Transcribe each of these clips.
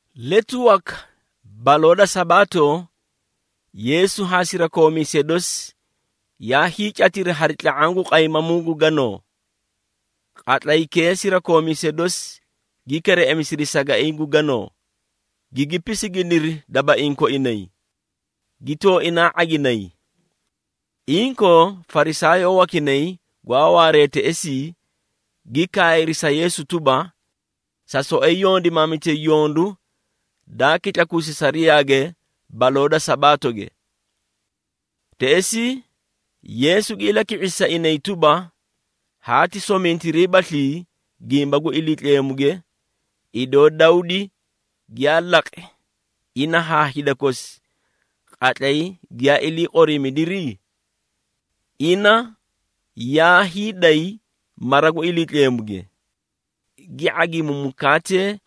Letu waka baloo da Sabaato, Yeesu haa sirakoomiisee dosi yaa hiicatiri hari tla⁄aã gu qaymamuu gu ganoo. Qatlaykee sirakoomiisee dosi gi kereꞌemisidi sagaiĩ gu ganoo, gigi pisiginiri dabaiĩ koinay, gi tooinaa ⁄aginay. Inkoo Farisaayoo wakinay gwaa waaree teꞌesii gi kaayri sa Yeesu tuba, “Sa soꞌoyi yondimaamitay yondu daa kitlakuusi sariyaage baloo da Sabaatoge!” Teꞌesii Yeesu gi ilaki⁄isi sa inay tuba, “Haati somintiriibaslii gimba gu Iliitleemuge, idoo Dawdi giyaa laqi ina haa hida kosi qatlay giyaa ilii qoriimidiri? Ina yaa hiiday mara gu Iliitleemuge, gi ⁄agimi mukaate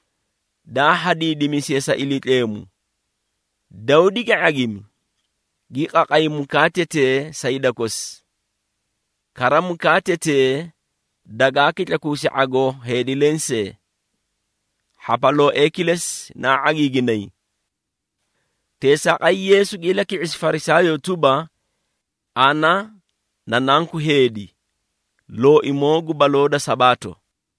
daa hadiidimisiye sa Iliitleemu, Dawdi gi ⁄agimi, gi qaqay mukaatetee sa hida kosi! Kara mukaatetee dagaa kitlakuusi ⁄agoo heedi lensee. Hhapalooee kilesi naa ⁄agiiginay.” Teesaaqay Yeesu gi ilaki⁄isi Farisaayoo tuba, “Ana na Nanku Heedi, Looimoo gu baloo da Sabaato.”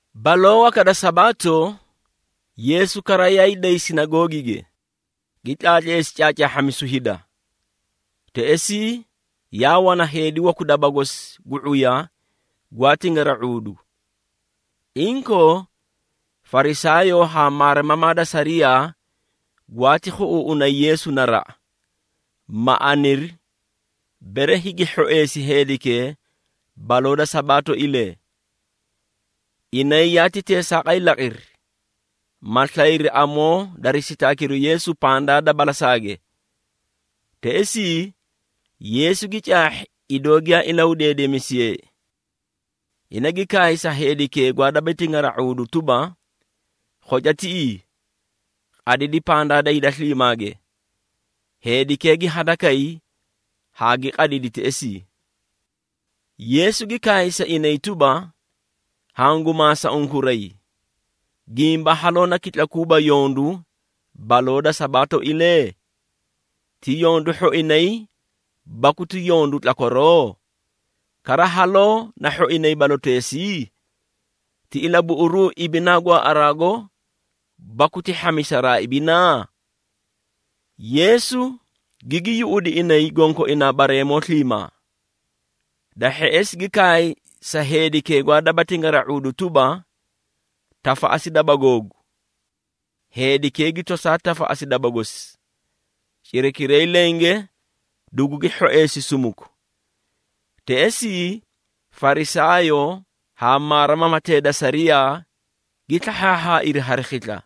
Baloo waka da Sabaato, Yeesu kara yaay day sinagoogige, gi tlaatleesi caacaahhamisu hida. Teꞌesii yaa wana heedi waku daba gosi gu ⁄uya gwaa tingara⁄uudu. Inkoo, Farisaayoo haa maarimamaa da sariyaa gwaati khuꞌuuꞌunay Yeesu naraꞌa, ma aniri, bere higi hhoeesi heedikee baloo da Sabaatoilee. Inay yaati teesaaqay laqiri, ma slayri amoo dari sitaakiru Yeesu pandaa da balasaage. Teꞌesii, Yeesu gi caahhi idoo giyaa ilahudeedemisiyeei. Ina gi kaay sa heedikee gwaa daba tingara⁄uudu tuba, “Khoca tiꞌii, qadidi pandaa da hida sliimaage.” Heedikee gi hadakay haa gi qadidi teꞌesii. Yeesu gi kaay sa inay tuba, “Hangu maasa unkuray, gimba haloo na kitlakuuba yondu baloo da Sabaatoilee? Ti yondu hhoinay baku ti yondu tlakwaroo? Kara haloo na hhoinay baloteesii? Ti ilabuꞌuruu ibinaa gwaaꞌaraago baku ti hhamisaraa ibinaa?” Yeesu gigi yuꞌudi inay gonkoinaa bareemoo sliimaa. Da hheꞌesi gi kaay sa heedikee gwaa daba tingara⁄uudu tuba, “Tafaꞌasi daba googu!” Heedikee gi tosaa tafaꞌasi daba gosi, cirakiray lenge dugugi hhoeesi sumuku. Teꞌesii Farisaayoo haa maarimamatee da sariyaa gi slahhaahhaairi hari khisla.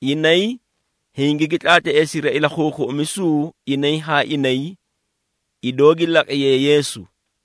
Inay hingigi tlaatleesiri ilakhuukhuꞌumisuu inay haa inay, idoo gi laqiyee Yeesu.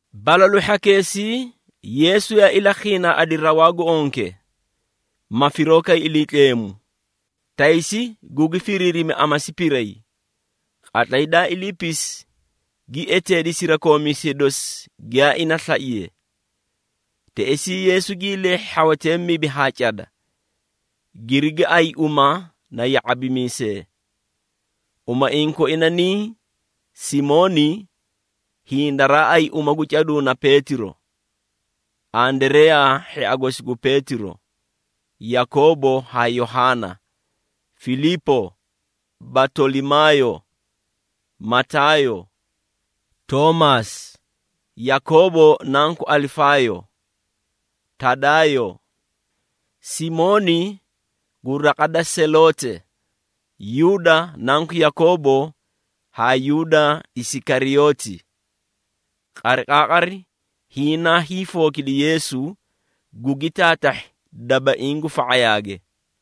Balalu hhakeesii Yeesu yaa ilakhiinaaꞌadi rawaa gu onke, ma firoo kay Iliitleemu, taysi gugi firiirimi amasi piray. Qatlay daa iliipisi, gi eteedi sirakoomiisee dosi giyaa ina slaiye. Teꞌesii Yeesu gii leehhi hhawatee mibi haa cada, girigi ayi uma na ya⁄abimiisee. Umaiĩ koina niĩ: Simooni (hiĩ daraa ayi uma gu caduu na Peetiro), Andareyaa hhia gosi gu Peetiro, Yakoobo haa Yohaana, Filiipo, Batolimaayo, Mataayo, Toomaasi, Yakoobo nanku Alifaayo, Tadaayo, Simooni gu raqa da Seloote, Yuuda nanku Yakoobo haa Yuuda Isikariyooti. Qariqaaqari hiĩ naa hiifookidi Yeesu, gugi taatahhi dabaiĩ gu fa⁄ayaage.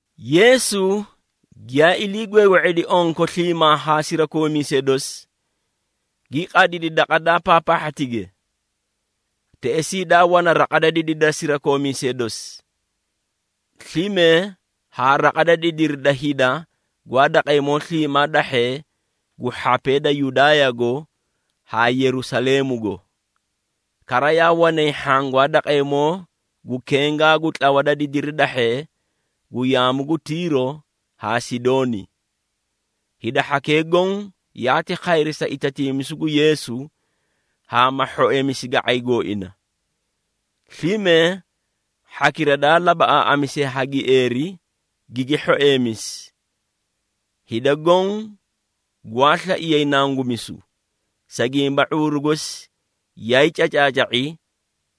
Yeesu giyaa ilii gweegwe⁄edi onko sliimaa haa sirakoomiisee dosi, gi qadidi daqa daa paapaahhatige. Teꞌesii daa wana raqa da didiri da sirakoomiisee dosi, slime haa raqa da didiri da hida gwaa daqeemoo sliimaa dahhee gu hhapee da Yudaayago haa Yerusaleemugo. Kara yaa wanay hhaã gwaa daqeemoo gu kengaa gu tlawa da didiri dahhee gu yaamu gu Tiiro haa Sidooni. Hida hhakee goõ yaati khayri sa itatiimisu gu Yeesu haa ma hhoeemisi ga⁄ay gooina. Slime hhakira daa labaꞌaaꞌamisiye ha gieeri, gigi hhoeemisi. Hida goõ gwaa slaiyay nangumisu, sa gimba ⁄uuru gosi yaay cacaaca⁄i,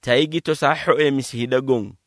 tay gi tosaa hhoeemisi hida goõ.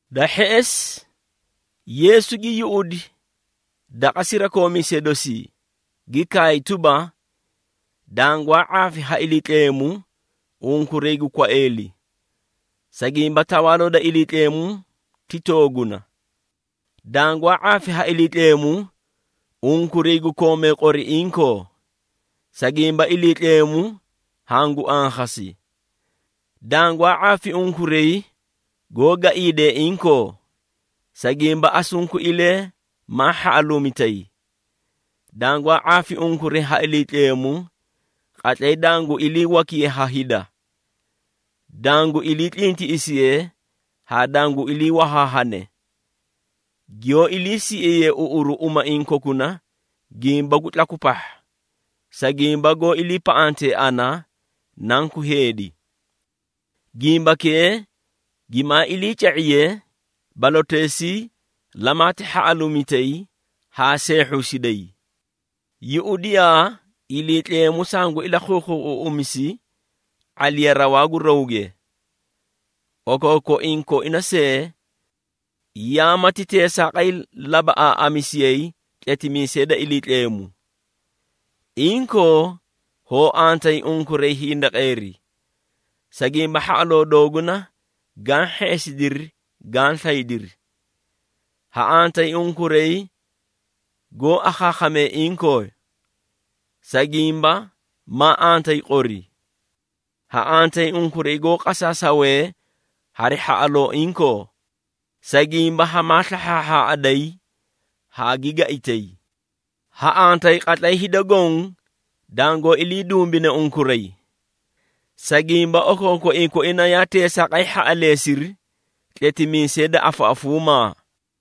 Da hheꞌesi Yeesu gi yuꞌudi daqa sirakoomiisee dosii, gi kaay tuba, “Dangwaa ⁄aafi ha Iliitleemu unkuray gu kwaeeli, sa gimba Tawaaloo da Iliitleemu ti tooguna. Dangwaa ⁄aafi ha Iliitleemu unkuray gu koomee qori inkoo, sa gimba Iliitleemu hangu ankhasi! Dangwaa ⁄aafi unkuray goó gaiidee inkoo, sa gimba asunkuilee maa hhaꞌaluumitay. Dangwaa ⁄aafi unkuray ha Iliitleemu qatlay dangu ilii wakiye ha hida, dangu ilii tlintiꞌisiye haa dangu ilii wahaahane, giyoó ilii siꞌiyee uꞌuru umaiĩ kokuna gimba gu tlaku pahha, sa gimba goó iliipaꞌantee ana, Nanku Heedi. Gimbakee gimaa iliica⁄iye, baloteesii lamaati hhaꞌaluumitay haa seehhuusiday! Yuꞌudiyaa, Iliitleemu sangu ilakhuukhuuꞌumisi ⁄aliya rawaa gu rawge. Okookoiĩ koina see, yaa mati teesaaqay labaꞌaaꞌamisiyay tletimiisee da Iliitleemu. Inkoo, hoo antayi, unkuray hindaqeeri, sa gimba hhaꞌaloo dooguna gaã hheꞌesidiri gaã slaydiri! Ha antayi unkuray goó akhaakhamee inkoo, sa gimba maa antayi qori! Ha antayi unkuray goó qasaasawe hari hhaꞌaloo inkoo, sa gimba hamaa slahhaahhaꞌaday haa gaitay! Ha antayi qatlay hida goõ dangoó ilii dumbine unkuray, sa gimba okookoiĩ koina yaa teesaaqay hhaꞌaleesiri tletimiisee da afaꞌafuumaa.”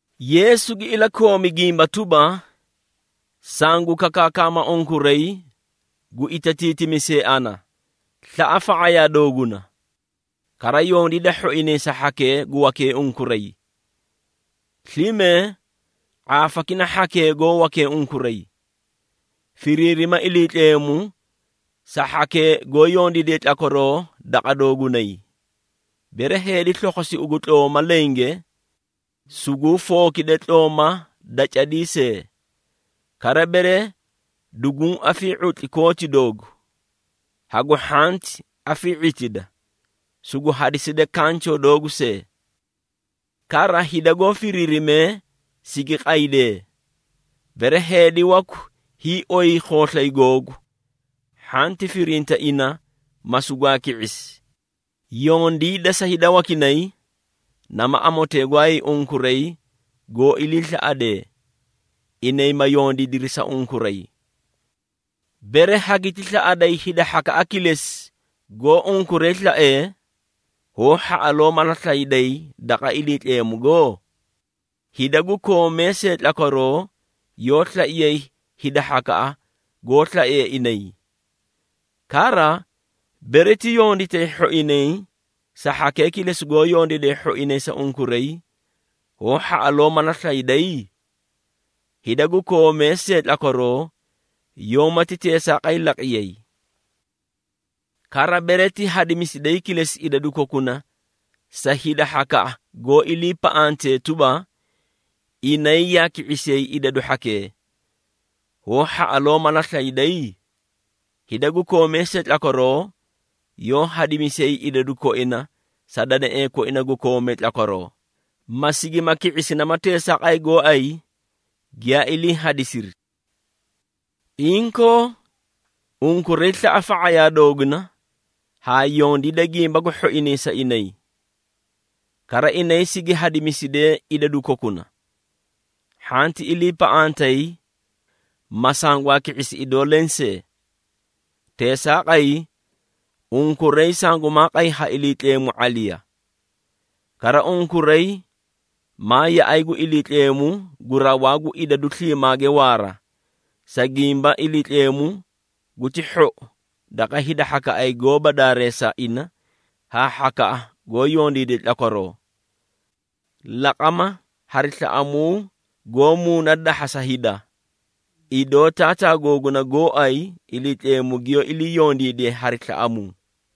Yeesu gi ilakoomi gimba tuba, “Sangu kakaakama unkuray gu itatiitimisee ana, slaꞌa fa⁄ayaa dooguna. Kara yondiida hhoinay sa hhakee gu wakee unkuray. Slime ⁄aafakina hhakee goó wakee unkuray, firiirima Iliitleemu sa hhakee goó yondiidiye tlakwaroo daqa doogunay. Bere heedi slokhosi ugu tlooma lenge, suguu fookide tlooma da cadii see. Kara bere dugu afii⁄utli kooti doogu, hagu hhanti afii⁄itida, sugu hadiside kanchoo doogu see. Kara, hida goó firiirimee sigi qaydee, bere heedi waku hiioy khooslay googu, hhanti firinta ina, ma sugwaa ki⁄isi. Yondiida sa hida wakinay, nama amotee gooay unkuray goó iliislaꞌadee, inay ma yondiidiri sa unkuray. Bere hagiti slaꞌaday hida hhakaꞌa kilesi goó unkuray slaee, hoó hhaꞌaloo mala slayday daqa Iliitleemugo? Hida gu koomee see tlakwaroo yoó slaiyay hida hhakaꞌa goó slaee inay. Kara, bere ti yonditay hhoinay sa hhakee kilesi goó yondiidee hhoinay sa unkuray, hoó hhaꞌaloo mala slayday? Hida gu koomee see tlakwaroo yoómati teesaaqay laqiyay! Kara, bere ti hadimisiday kilesi idadu kokuna sa hida hhakaꞌa goó iliipaꞌante tuba, inay yaa ki⁄isiyay idadu hhakee, hoó hhaꞌaloo mala slayday? Hida gu koomee see tlakwaroo yoó hadimisiyay idadu koina sa danaee koina gu koomee tlakwaroo, ma sigima ki⁄isi nama teesaaqay gooay giyaa ilii hadisiri! Inkoo, unkuray slaꞌa fa⁄ayaa dooguna haa yondiida gimba gu hhoinay sa inay. Kara inay sigi hadimisidee idadu kokuna, hhanti iliipaꞌantay, ma sangwaa ki⁄isi idoo lensee. Teesaaqay unkuray sangumaa qay ha Iliitleemu ⁄aliya. Kara unkuray maa yaꞌay gu Iliitleemu gu Rawaa gu Idadu Sliimaage Waara, sa gimba Iliitleemu guti hhou daqa hida hhakaꞌay goóba daareesa ina haa hhakaꞌa goó yondiidee tlakwaroo. Laqama hari slaꞌamuu goó muuna dahha sa hida, idoo Taataa googuna gooay Iliitleemu giyoó ilii yondiidiye hari slaꞌamuu.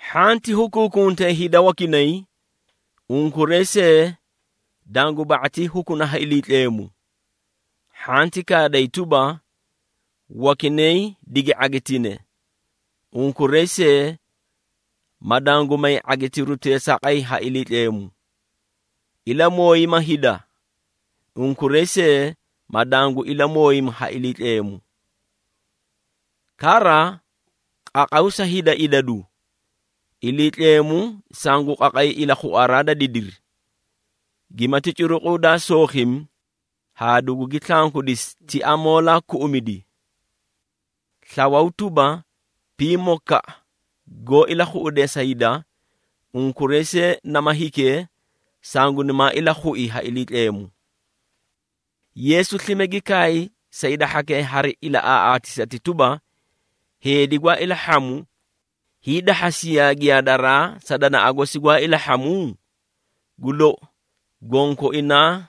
Hhanti hukuukuntay hida wakinay, unkuray see dangu ba⁄atii hukuna ha Iliitleemu. Hhanti kaaday tuba, wakinay digi ⁄agitine, unkuray see ma dangu may ⁄agitiru teesaaqay ha Iliitleemu. Ilamooyima hida, unkuray see ma dangu ilamooyimi ha Iliitleemu. Kara qaqaw sa hida idadu, Iliitleemu sangu qaqay ilakhuaraa da didiri, gimati curuqu daa sookhimi haa dugugi slankudisi ti amoolaa kuꞌumidi. Slawaw tuba, pimokaꞌa goó ilakhuꞌudee sa hida, unkuray see nama hikee, sangunimaa ilakhui ha Iliitleemu!” Yeesu slime gi kaay sa hida hhakee hari ilaꞌaaꞌaatisati tuba, “Heedi gwaa ilahhamu hiidahhasiyaa giyaadaraa sa danaꞌa gosi gwaa ilahhamu? Gu lou, gonkoinaa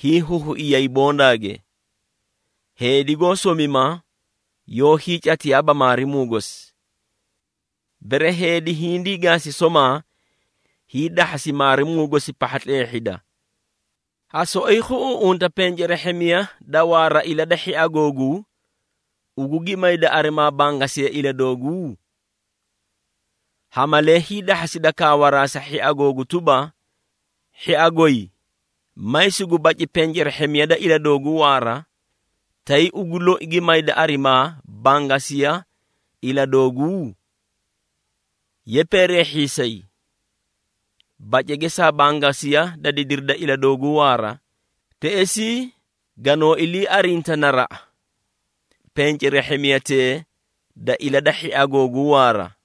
hiihuhuiyay bondagee? Heedi goó somima yoó hiicatiyaaba maarimuu gosi. Bere heedi hindii gaasi somaa, hiidahhasi maarimuu gosi pahha tleehhida. Ha soꞌoyi khuꞌuuꞌunta pencerehhemiya da waara ila da hhia googuu, ugu gi mayda arimaa bangasiya ila dooguu? Ha malee hiidahhasida kaawaraa sa hhia googu tuba, ‘Hhia goy, may sugu baci pencerehhemiya da ila dooguu waara,’ tay ugu loi gi mayda arimaa bangasiya ila dooguu? Ye peereehhiisay! Bace geesaa bangasiya da didiri da ila dooguu waara, teꞌesii ganoo ilii arinta naraꞌa pencerehhemiyatee da ila da hhia googuu waara.”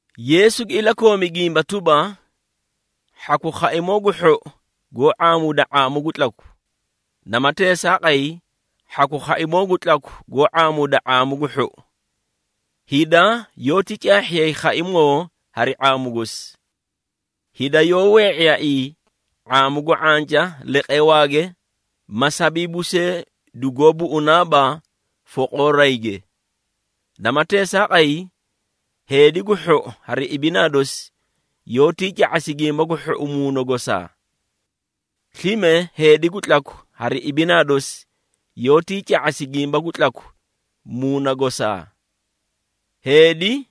Yeesu gi ilakoomi gimba tuba, “Hhaku khaimoo gu hhou goó ⁄aamuuda ⁄aamu gu tlaku, nama teesaaqay hhaku khaimoo gu tlaku goó ⁄aamuuda ⁄aamu gu hhou. Hida yoóti caahhiyay khaimoo hari ⁄aamu gosi. Hida yoó wee⁄iyaaii ⁄aamu gu ⁄anca leqeewaage ma sabiibu see dugoó buꞌunaaba foqoorayge. Nama teesaaqay heedi gu hhou hari ibinaa dosi yoótii ca⁄asi gimba gu hhou muuna gosaa. Slime heedi gu tlaku hari ibinaa dosi yoótii ca⁄asi gimba gu tlaku muuna gosaa. Heedi,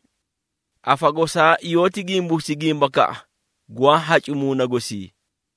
afa gosaa yoóti gimbuusi gimbakaꞌa gwaa hacu muuna gosii.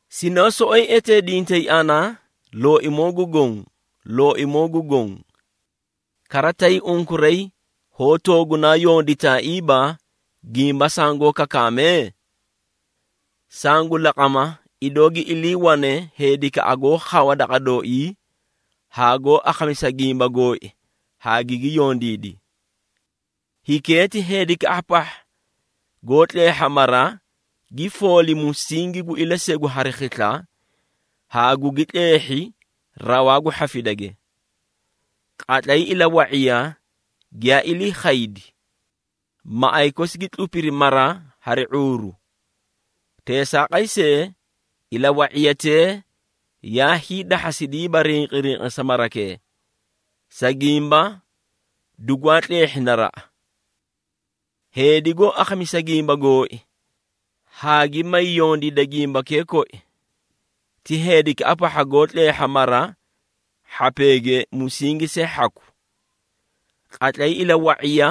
Sinoó soꞌoyi eteedintay ana, ‘Looimoo gu Goõ, Looimoo gu Goõ!’ Kara tay unkuray hoó toogunaa yonditaaiiba gimba sangoó kakaame? Sangu laqama, idoo gi iliiwane heedikaꞌa goó khawa daqa dooii haa goó akhamisa gimba gooi haa gigi yondiidi. Hikee ti heedikaꞌa pahha goó tleehha mara, gi fooli musingi gu ilasegu hari khisla haa gugi tleehhi rawaa gu hhafidage. Qatlay ilawa⁄iya giyaa ilii khaydi, maꞌay kosi gi tlupiri mara hari ⁄uuru. Teesaaqay see, ilawa⁄iyatee yaa hiidahhasidiiba rinqirinqisa marakee, sa gimba dugwaa tleehhi naraꞌa. Heedi goó akhamisa gimba gooi, haa gi may yondiida gimbakee koi, ti heedikaꞌa pahha goó tleehha mara hhapeege musingi see hhaku. Qatlay ilawa⁄iya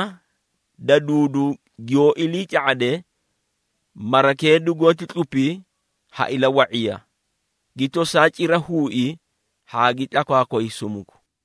da duudu giyoó ilii ca⁄ade, marakee dugoóti tlupi ha ilawa⁄iya, gi tosaa cira huui haa gi tlakwaakway sumuku!”